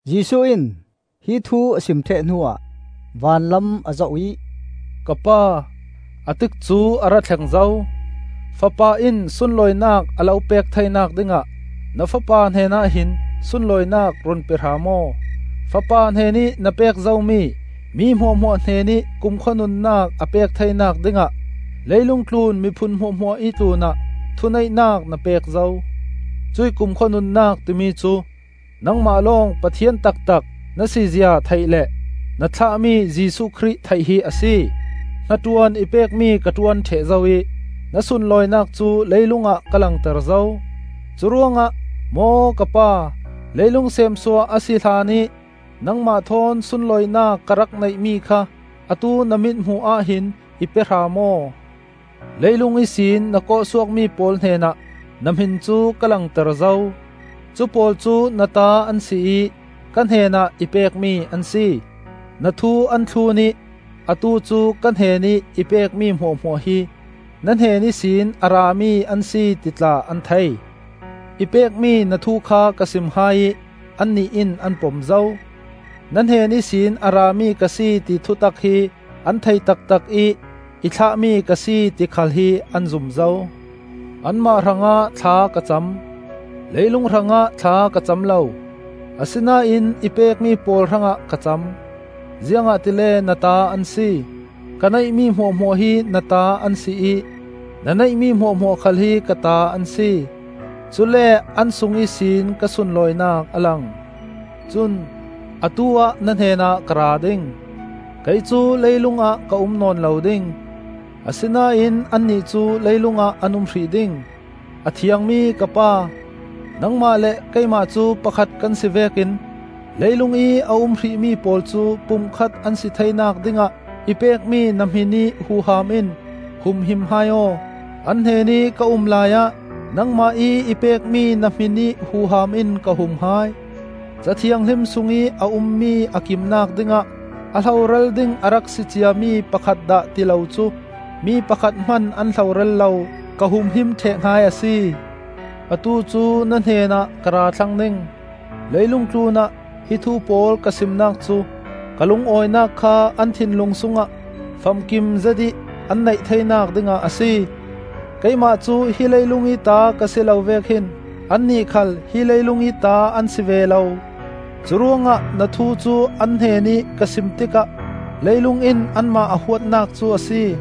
Jesuh in hi thu a sim ṭheh hnuah vanlam a zoh ih, “Ka Pa, a tikcu a ra thleng zo. Fapa in sunlawinak a lo pek theinak dingah na Fapa hnenah hin sunlawinak run pe hram aw. Fapa hnenih na pek zomi mi hmuahhmuah hnenih kumkhua nunnak a pek theinak dingah leilung tlun miphun hmuahhmuahih tlunah thuneihnak na pek zo. Cuih kumkhua nunnak timi cu nangmah lawng Pathian taktak na sizia theih le na thlahmi Jesuh Khrih theih hi a si. Hnaṭuan i pekmi ka ṭuan ṭheh zo ih na sunlawinak cu leilung ah ka langter zo. Curuangah maw ka Pa, leilung seemsuah a si hlanih nangmah thawn sunlawinak ka rak neihmi kha atu na mithmuh ah hin i pe hram aw! “Leilung ihsin na kawhsuakmi pawl hnenah na hmin cu ka langter zo. Cupawl cu na ta an si ih ka hnenah i pekmi an si. Na thu an thlun ih, atu cu ka hnenih i pekmi hmuahhmuah hi na hnen ihsin a rami an si ti tla an thei. I pekmi na thu kha ka sim hai ih annih in an pom zo. Na hnen ihsin a rami ka si ti thutak hi an thei taktak ih i thlahmi ka si ti khal hi an zum zo. “Anmah hrangah thla ka cam. Leilung hrangah thla ka cam lo, asinain i pekmi pawl hrangah ka cam; ziangahtile na ta an si. Ka neihmi hmuahhmuah hi na ta an si ih na neihmi hmuahhmuah khal hi ka ta an si; cule an sung ihsin ka sunlawinak a lang. Cun atu-ah na hnenah ka ra ding; kei cu leilungah ka um nawn lo ding, asinain annih cu leilungah an um hrih ding. A Thiangmi ka Pa, nangmah le keimah cu pakhat kan si vekin leilungih a um hrihmi pawl cu pumkhat an si theinak dingah i pekmi na hminih huham in humhim hai aw. An hnenih ka um laiah nangmah ih i pekmi na hminih huham in ka hum hai. Ca Thianghlim sungih a ummi a kimnak dingah a hloral ding a rak si ciami pakhat dah ti lo cu mi pakhat hman an hloral lo; ka humhim ṭheh hai a si. Atu cu na hnenah ka ra thlang ding; leilung tlunah hi thu pawl ka simnak cu ka lungawinak kha an thinlung sungah famkim zetih an neih theinak dingah a si. Keimah cu hi leilungih ta ka si lo vek hin annih khal hi leilungih ta an si ve lo; curuangah na thu cu an hnenih ka sim tikah leilung in anmah a huatnak cu a si.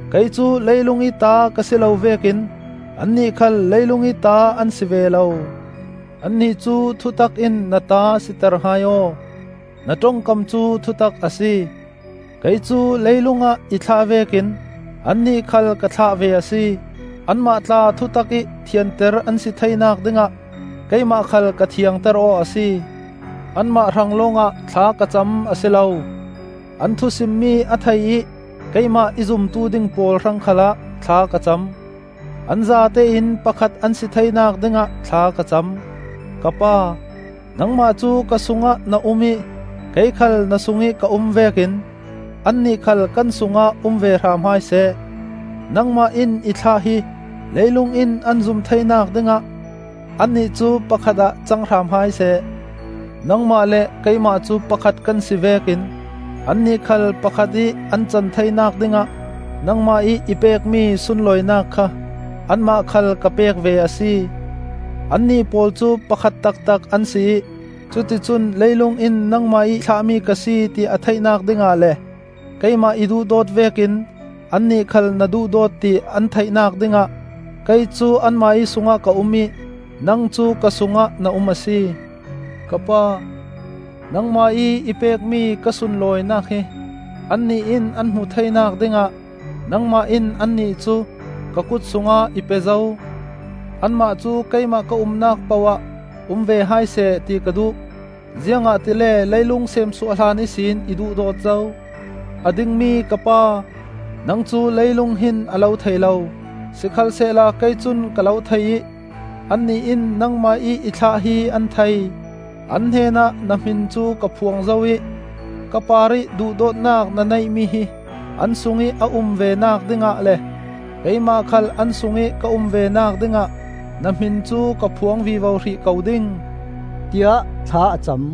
Kei cu leilungih ta ka si lo vekin annih khal leilungih ta an si ve lo. Annih cu thutak in na ta siter hai aw; na ṭongkam cu thutak a si. Kei cu leilungah i thlah vekin annih khal ka thlah ve a si. Anmah tla thutak ih thianter an si theinak dingah keimah khal ka thiangter aw a si. “Anmah hrang lawngah thla ka cam a si lo; an thusimmi a thei ih keimah i zumtu ding pawl hrang khalah thla ka cam. An zatein pakhat an si theinak dingah thla ka cam. Ka Pa, nangmah cu ka sungah na um ih kei khal na sungih ka um vekin annih khal kan sungah um ve hram hai seh. Nangmah in i thlah hi leilung in an zum theinak dingah annih cu pakhat ah cang hram hai seh. Nangmah le keimah cu pakhat kan si vekin annih khal pakhat ih an can theinak dingah nangmah ih i pekmi sunlawinak kha anmah khal ka pek ve a si. Annih pawl cu pakhat taktak an si ih cuticun leilung in nangmah ih thlahmi ka si ti a theihnak dingah le keimah i duhdawt vekin annih khal na duhdawt ti an theihnak dingah kei cu anmah ih sungah ka um ih nang cu ka sungah na um a si. “Ka Pa, nangmah ih i pekmi ka sunlawinak hi annih in an hmuh theinak dingah nangmah in annih cu ka kut sungah i pe zo. Anmah cu keimah ka umnak poh-ah um ve hai seh ti ka duh; ziangahtile leilung seemsuah hlan ihsin i duhdawt zo. A dingmi ka Pa, nang cu leilung hin a lo thei lo, sikhalsehla kei cun ka lo thei ih annih in nangmah ih i thlah hi an thei. An hnenah na hmin cu ka phuang zo ih, ka parih duhdawtnak na neihmi hi an sungih a um venak dingah le keimah khal an sungih ka um venak dingah na hmin cu ka phuang vivo hrih ko ding,” tiah thla a cam.